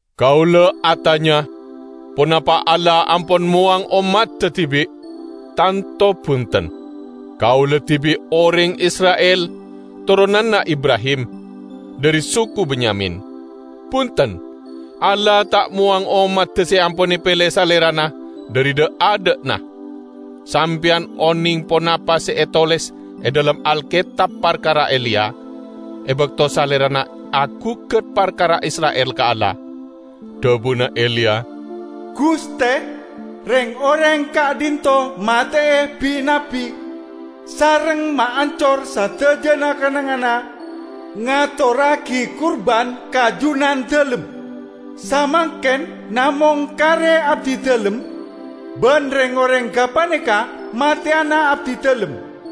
Kaula atanya: Ponapa Allah ampon mowang ommadda dibi'? Tanto bunten! Kaula dibi' oreng Isra'il toronanna Ibrahim, dhari suku Benyamin. Bunten! Allah ta' mowang ommadda se ampon epele Salerana dhari dha'-adha'na. Sampeyan oneng ponapa se etoles e dhalem Alketab parkara Eliya, e bakto salerana agugat parkara Isra'il ka Allah. Dhabuna Eliya, "Guste, reng-oreng ka'dhinto' mate'e bi-nabbi sareng maancor sadajana kennengnganna ngatorragi kurban ka Junandalem. Samangken namong kare abdidalem, ban reng-oreng gapaneka mateyana abdidalem."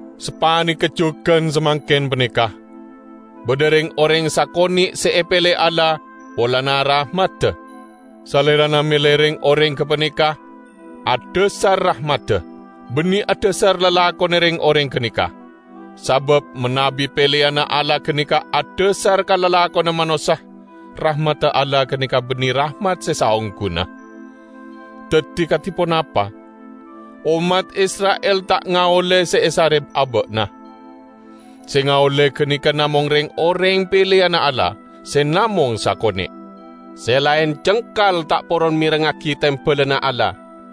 Sapaneka jugan samangken paneka; badha reng-oreng sakone' se epele Allah polana rahmadda. Salerana mele reng-oreng gapaneka adhasar rahmadda, banne adhasar lalakonna reng-oreng ganeka. Sabab manabi peleyanna Allah ganeka adhasar ka lalakonna manossa, rahmadda Allah ganeka banne rahmat se saongguna. Daddi kadi ponapa? Ommat Isra'il ta' ngaolle se esare aba'na. Se ngaolle ganeka namong reng-oreng peleyanna Allah, se namong sakone'. Se laen cengkal ta' poron merengngagi tembalanna Allah.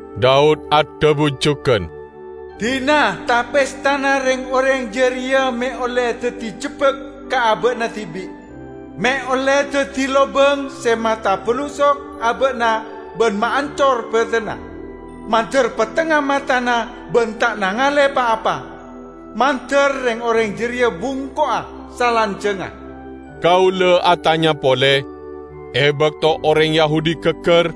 Daud adhabu jugan, Dina ta-pestana reng-oreng jareya me' olle daddi jebbak ka aba'na dibi', me' olle daddi lobang se matabalusok aba'na ban maancor badanna! Mandar pettengnga matana ban ta' nangale pa-apa; mandar reng-oreng jareya bungko'a salanjangnga." Kaula atanya pole: E bakto oreng Yahudi gaggar,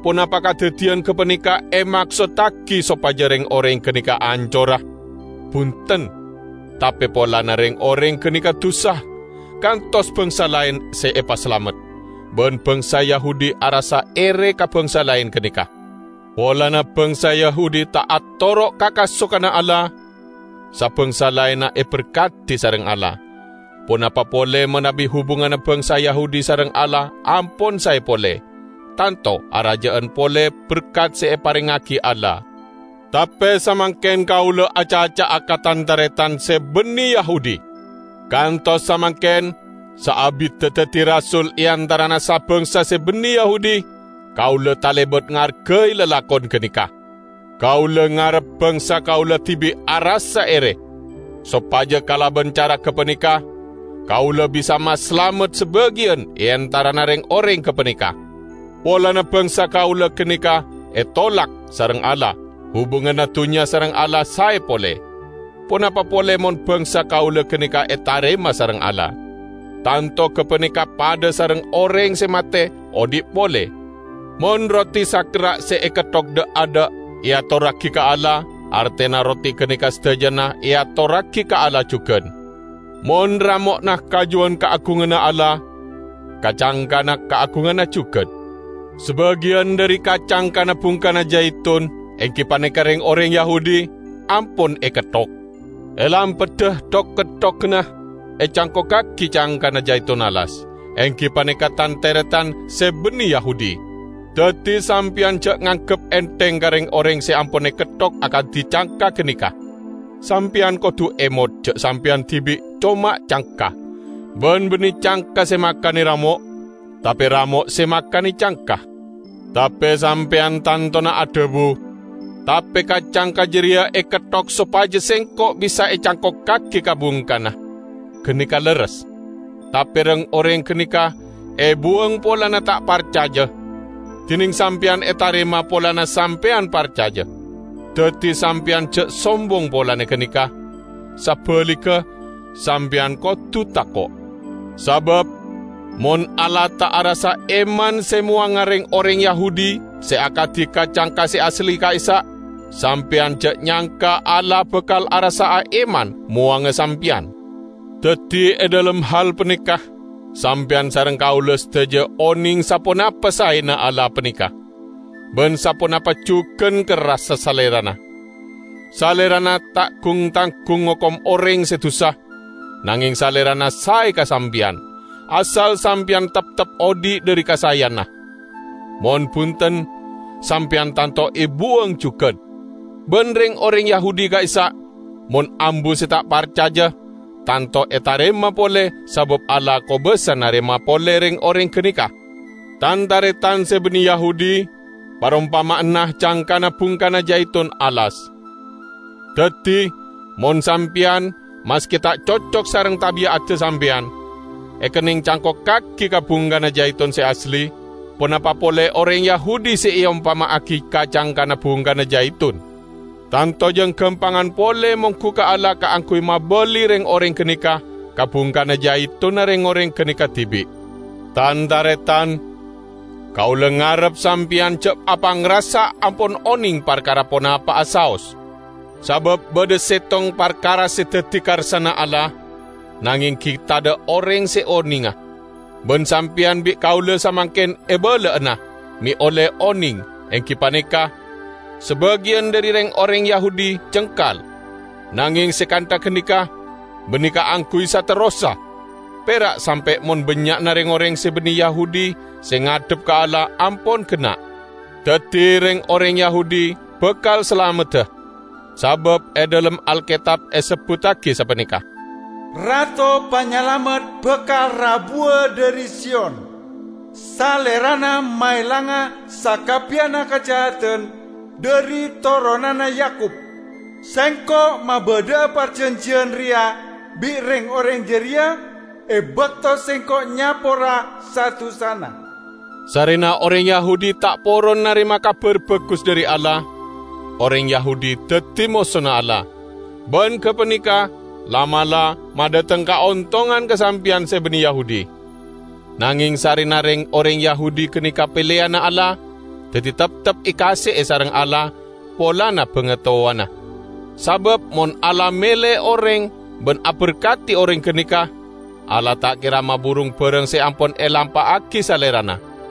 ponapa kadaddiyan gapaneka emaksottagi sopaja reng-oreng ganeka ancora? Bunten! Tape polana reng-oreng ganeka dusa, kantos bangsa laen se epasalamet, ban bangsa Yahudi arassa ere ka bangsa laen ganeka. Polana bangsa Yahudi ta' atoro' ka kasokanna Allah, sa-bangsa laen eberkadi sareng Allah. Ponapa pole manabi hubunganna bangsa Yahudi sareng Allah ampon sae pole; tanto araja'an pole berkat se eparengngagi Allah. Tape samangken kaula acaca'a ka tan-taretan se banne Yahudi! Kantos samangken, saabidda daddi rasul e antarana sa-bangsa se banne Yahudi, kaula talebat ngargai lalakon ganeka. Kaula ngarep bangsa kaula dibi' arassa ere, sopaja kalaban cara gapaneka kaula bisa masalamet sabagiyan e antarana reng-oreng gapaneka. Polana bangsa kaula ganeka etolak sareng Allah, hubunganna dunnya sareng Allah sae pole; ponapa pole mon bangsa kaula ganeka etarema sareng Allah! Tanto gapaneka padha sareng oreng se mate odhi' pole! Mon roti sakerra' se eketthok dha'-adha' eatorragi ka Allah, artena roti ganeka sadajana eatorragi ka Allah jugan. Mon ramo'na kajuwan kaagunganna Allah, ka-cangkana kaagunganna jugan. Sabagiyan dhari ka-cangkana bungkana jaitun -- enggi paneka reng-oreng Yahudi -- ampon eketthok. E lampadda thok-ketthoganna ecangkokkagi cangkana jaitun alas, enggi paneka tan-taretan se banne Yahudi. Daddi sampeyan ja' nganggep entheng ka reng-oreng se ampon eketthok akadi cangka ganeka. Sampeyan kodu emot ja' sampeyan dibi' coma cangka; ban banne cangka se makane ramo', tape ramo' se makane cangka. Tape Sampeyan tantona adhabu, "Tape ka-cangka jareya eketthok sopaja sengko' bisa ecangkokkagi ka bungkana!" Ganeka lerres. Tape reng-oreng ganeka ebuwang polana ta' parcaja, dineng sampeyan etarema polana sampeyan parcaja. Daddi sampeyan ja' sombong polana ganeka; sabaligga sampeyan kodu tako'. Sabab mon Allah ta' arassa eman se mowanga reng-oreng Yahudi se akadi ka-cangka se asli ka'issa', sampeyan ja' nyangka Allah bakal arassa'a eman mowanga sampeyan! Daddi e dhalem hal paneka sampeyan sareng kaula sadaja oneng saponapa saena Allah paneka, ban saponapa jugan kerrassa Salerana. Salerana ta' gung-tanggung ngokom oreng se dusa, nangeng Salerana sae ka sampeyan -- asal sampeyan teptep odhi' dhari kasaeyanna. Mon bunten, sampeyan tanto ebuwang jugan. Ban reng-oreng Yahudi ka'issa', mon ambu se ta' parcaja, tanto etarema pole, sabab Allah kobasa narema pole reng-oreng ganeka. Tan-taretan se banne Yahudi parompama'anna cangkana bungkana jaitun alas. Daddi, mon sampeyan, maske ta' cocok sareng tabi'adda sampeyan, ekenneng cangkokkagi ka bungkana jaitun se asli, ponapa pole oreng Yahudi se eompama'agi ka-cangkana bungkana jaitun. Tanto jang gampangan pole monggu ka Allah kaangguy mabali reng-oreng ganeka ka bungkana jaitunna reng-oreng ganeka dibi'. Tan-taretan! Kaula ngarep sampeyan ja' apangrasa ampon oneng parkara ponapa'a saos. Sabab badha settong parkara se daddi karsana Allah, nangeng gi' tadha' oreng se onenga. Ban sampeyan bi' kaula samangken ebala'ana, me' olle oneng, enggi paneka: Sabagiyan dhari reng-oreng Yahudi cengkal, nangeng se kantha ganeka banne kaangguy saterrossa, pera' sampe' mon bannya'na reng-oreng se banne Yahudi se ngadhep ka Allah ampon genna'. Daddi reng-oreng Yahudi bakal salamedda. Sabab e dhalem Alketab esebbuttagi sapaneka, "Rato Panyalamet bakal rabuwa dhari Siyon; Salerana maelanga sakabbiyanna kajahadan dhari toronanna Yakub. Sengko' mabadha'a parjanjiyan reya bi' reng-oreng jareya e bakto Sengko' nyapora sa-dusana." Sarrena oreng Yahudi ta' poron narema Kabar Bagus dhari Allah, oreng Yahudi daddi mosona Allah; ban gapaneka la'-mala' madhateng kaontongan ka sampeyan se banne Yahudi. Nangeng sarrena reng-oreng Yahudi ganeka peleyanna Allah, daddi teptep ekaase'e sareng Allah polana bangatowana. Sabab mon Allah mele oreng ban aberkadi oreng ganeka, Allah ta' kera maburung barang se ampon elampa'agi Salerana.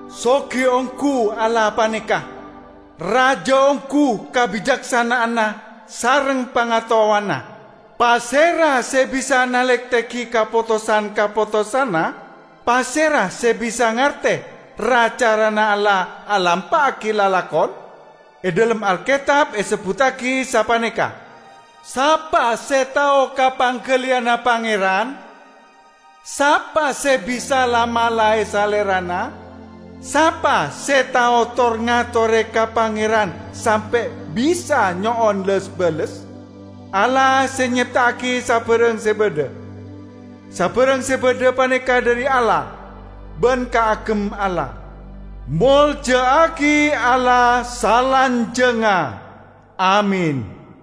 Sogi onggu Allah paneka! Raja onggu kabicaksana'anna sareng pangataowanna! Pasera se bisa nalektegi kapotosan-kapotosanna? Pasera se bisa ngarte ra-carana Allah alampa'agi lalakon? E dhalem Alketab esebbuttagi sapaneka, "Sapa se tao ka panggaliyanna Pangeran? Sapa se bisa la-malae Salerana? Sapa se tao tor-ngatore ka Pangeran sampe' bisa nyo'on les-bales?" Allah se nyepta'agi sabarang se badha. Sabarang se badha paneka dhari Allah ban kaagem Allah. Molja'agi Allah salanjangnga! Amin.